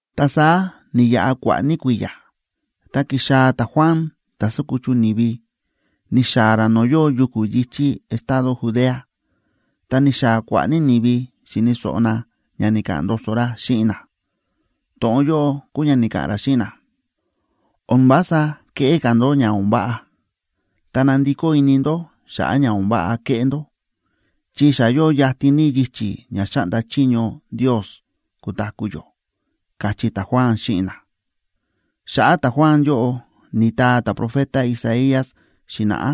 Ta saá ni̱yaꞌa kua̱ꞌa̱ ní kui̱ya̱, ta ki̱xaa̱ ta̱Juan ta̱ sákuchu ni̱vi, ni̱xaa̱ ra no̱o̱ yóo yuku̱ yi̱chí estado Judea. Ta ni̱xaa̱ kua̱ꞌa̱ ní ni̱vi xi̱ni̱ so̱ꞌo na ña ni̱ka̱ꞌa̱n ndoso ra xíꞌin na. To̱ꞌon yóꞌo kúu ña ni̱ka̱ꞌa̱n ra xíꞌin na: ―O̱n vása keꞌé ka̱ ndó ña o̱n váꞌa, ta nandikó ini ndó xa̱ꞌa̱ ña o̱n váꞌa ke̱ꞌé ndó, chi xa yóo yatin ní yichi̱ ña xáꞌnda chiño Ndios kutaku̱ yó ―káchí ta̱Juan xíꞌin na. Xa̱ꞌa̱ ta̱Juan yóꞌo ni̱taa ta̱profeta Isaías xi̱na̱ꞌá,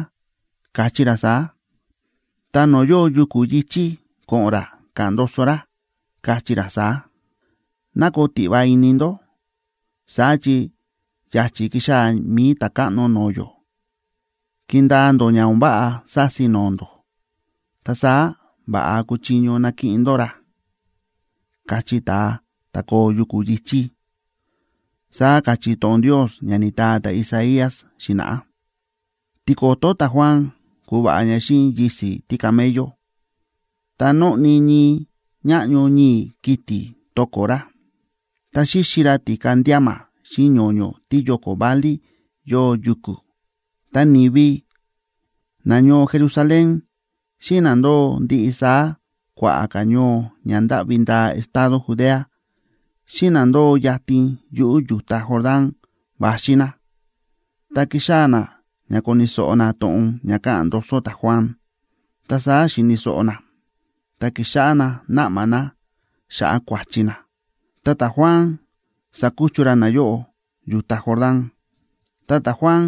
káchí ra saá: Ta no̱o̱ yóo yuku̱ yi̱chí ko̱ꞌo̱n ra ka̱ꞌa̱n ndoso ra, kachí ra saá: “Ná koo tiꞌva ini ndó, saá chi ya̱chi̱ kixaa̱ mi̱i Ta̱káꞌno no̱o̱ yó; kindaa ndó ña o̱n váꞌa sási no̱o̱ ndó, ta saá va̱ꞌa kuchiño nakiꞌin ndó ra”, kachí ta̱a ta̱ koo yuku̱ yi̱chí, saá káchí to̱ꞌon Ndios ña ni̱taa ta̱Isaías xi̱na̱ꞌá. Tiko̱to̱ ta̱Juan ku̱va̱ꞌa ña xíꞌin yisi̱ tícamello, ta nóꞌni ñii ñáꞌño ñii̱ kiti̱ to̱ko̱ ra. Ta xíxi ra ti̱ka ndíama xíꞌin ño̱ño̱ tíyóko̱ válí yóo yuku̱. Ta ni̱vi nañoo Jerusalén, xíꞌin na ndóo ndiꞌi saá kua̱ꞌa̱ ka̱ ñoo ña ndáꞌvi ndaa estado Judea, xíꞌin na ndóo yatin yuꞌu̱ yu̱ta Jordán va̱xi na, ta ki̱xaa̱ na ña koni̱ so̱ꞌo na to̱ꞌon ña káꞌa̱n ndoso ta̱Juan. Ta saá xi̱ni̱ so̱ꞌo na, ta ki̱xáꞌá na náꞌma na xa̱ꞌa̱ kua̱chi na. Ta ta̱Juan sa̱kuchu ra nayóꞌo yu̱ta Jordán. Ta ta̱Juan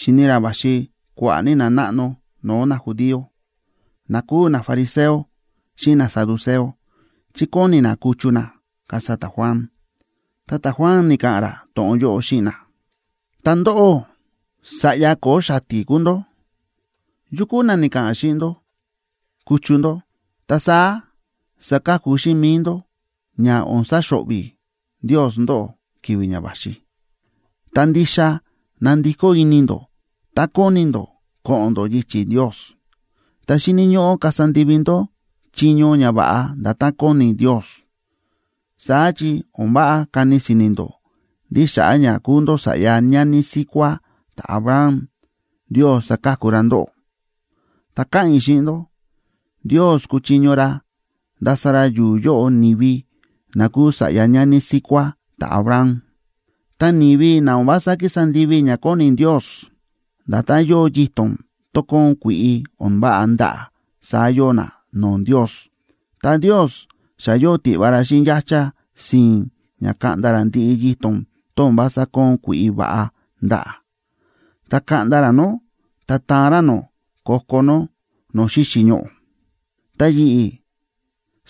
xi̱ni ra va̱xi kua̱ꞌa̱ ní nanáꞌno no̱o̱ najudío, na kúu nafariseo xíꞌin nasaduceo, chi kóni na kuchu na, kasa ta̱Juan. Ta ta̱Juan ni̱ka̱ꞌa̱n ra to̱ꞌon yóꞌo xíꞌin na: ―Ta ndóꞌó, ¡sa̱ꞌya ko̱o̱ xati̱ kúu ndó! ¿Yu kúu na ni̱ka̱ꞌa̱n xíꞌin ndó kuchu ndó, ta saá saka̱ku xíꞌin mi̱i ndó ña o̱n saxo̱ꞌvi̱ Ndios ndóꞌó ki̱vi̱ ña va̱xi? Tá ndixa na̱ndikó ini ndó ta kóni ndó ko̱ꞌo̱n ndó yichi̱ Ndios, ta xíni̱ ñóꞌó kasa ndivi ndó chiño ñava̱ꞌa nda̱tán kóni Ndios. Saá chi o̱n váꞌa kani si̱ni̱ ndó ndí xa̱ꞌa̱ ña kúu ndó sa̱ꞌya ñani síkuá ta̱Abraham, Ndios saka̱ku ra ndóꞌó. Ta káꞌa̱n i̱ xíꞌin ndó, Ndios kúchiño ra ndasa ra yu̱u̱ yóꞌo ni̱vi na kuu sa̱ꞌya ñani síkuá ta̱Abraham. Ta ni̱vi na o̱n vása kísa ndivi ña kóni Ndios, nda̱tán yóo yito̱n tón kóon kui̱ꞌi o̱n váꞌa ndaꞌa̱, saá yóo na no̱o̱ Ndios. Ta Ndios xa yóo tiꞌva ra xíꞌin yáchá si̱i̱n ña kaꞌnda ra ndiꞌi yito̱n tón o̱n vása kóon kui̱ꞌi va̱ꞌa ndaꞌa̱, ta kaꞌnda ra nó, ta taan ra nó ko̱ko̱ nó no̱o̱ xíxi̱ ñoꞌo̱. Ta yi̱ꞌi̱,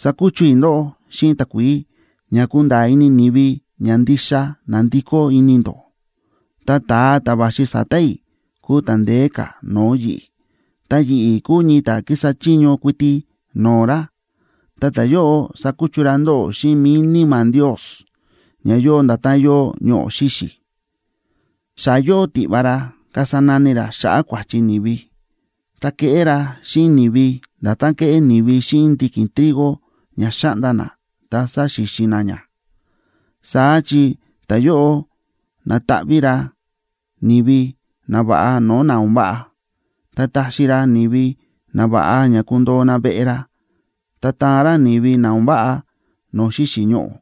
sákuchu i̱ ndóꞌó xíꞌin takuií, ña kunda̱a̱ ini ni̱vi ña ndixa na̱ndikó ini ndó. Ta ta̱a ta̱ va̱xi sa̱ta̱ i̱ kúu ta̱ ndeé ka̱ no̱o̱ yi̱ꞌi̱. Ta yi̱ꞌi̱ kúu ñii ta̱ kísa chiño kuiti no̱o̱ ra. Ta ta̱yóꞌo sakuchu ra ndóꞌó xíꞌin mi̱i Níma̱ Ndios, ña yóo nda̱tán yóo ñoꞌo̱ xíxi̱. Xa yóo tiꞌva ra kasa nani ra xa̱ꞌa̱ kua̱chi ni̱vi, ta keꞌé ra xíꞌin ni̱vi nda̱tán kéꞌé ni̱vi xíꞌin ndiki̱n trigo ña xa̱ꞌnda na ta sa̱xixin na ña. Saá chi ta̱yóꞌo nataꞌví ra ni̱vi nava̱ꞌa no̱o̱ na o̱n váꞌa. Ta taxi va̱ꞌa ra ni̱vi nava̱ꞌa ña kundoo na veꞌe ra, ta taan ra ni̱vi na o̱n váꞌa no̱o̱ xíxi̱ ñoꞌo̱,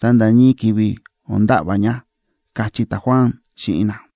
ta nda̱ ñii ki̱vi̱ o̱n nda̱ꞌva̱ ña ―káchí ta̱Juan xíꞌin na.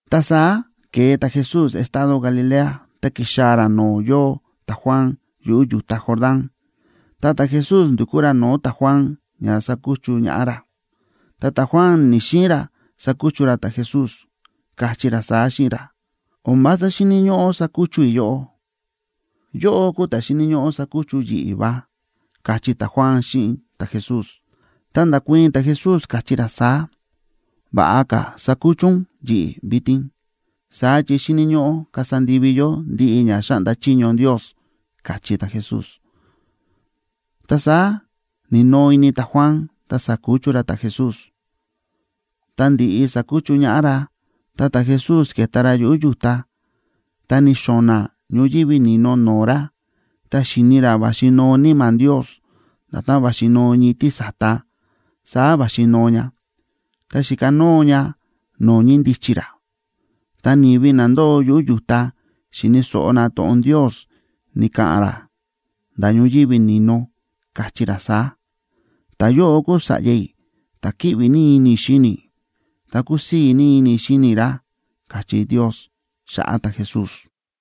Ta saá ke̱e ta̱Jesús estado Galilea, ta ki̱xaa̱ ra no̱o̱ yóo ta̱Juan yuꞌu̱ yu̱ta Jordán, ta ta̱Jesús ndu̱kú ra no̱o̱ ta̱Juan ña sakuchu ñaꞌá ra. Ta ta̱Juan ni̱‑xiin ra sakuchu ra ta̱Jesús, káchí ra saá xíꞌin ra: ―O̱n vása xíni̱ ñóꞌó sakuchu i̱ yóꞌó. Yóꞌó kúu ta̱ xíni̱ ñóꞌó sakuchu ún yi̱ꞌi̱ va ―káchí ta̱Juan xíꞌin ta̱Jesús. Ta nda̱kuii̱n ta̱Jesús, káchí ra saá: ―Va̱ꞌa ka̱ sakuchu ún yi̱ꞌi̱ vitin, saá chi xíni̱ ñóꞌó kasa ndivi yó ndiꞌi ña xáꞌnda chiño Ndios ―káchí ta̱Jesús. Ta saá ni̱noo ini ta̱Juan, ta sa̱kuchu ra ta̱Jesús. Tá ndi̱ꞌi sa̱kuchu ñaꞌá ra, ta ta̱Jesús ke̱ta ra yuꞌu̱ yu̱ta. Ta ni̱xo̱na̱ ñoyívi ni̱no no̱o̱ ra, ta xi̱ni ra va̱xi noo Níma̱ Ndios, nda̱tán va̱xi noo ñii tísa̱ta, saá va̱xi noo ña, ta xi̱kanóo ña no̱o̱ ñíndichi ra. Ta ni̱vi na ndóo yuꞌu̱ yu̱ta xi̱ni̱ so̱ꞌo na to̱ꞌon Ndios ni̱ka̱ꞌa̱n ra nda̱ ñoyívi ni̱no, káchí ra saá: ―Ta̱yóꞌo kúu Sa̱ꞌya i̱, ta̱ kíꞌvi ní ini i̱ xíni i̱, ta kúsii̱ ní ini i̱ xíni i̱ ra ―káchí Ndios xa̱ꞌa̱ ta̱Jesús.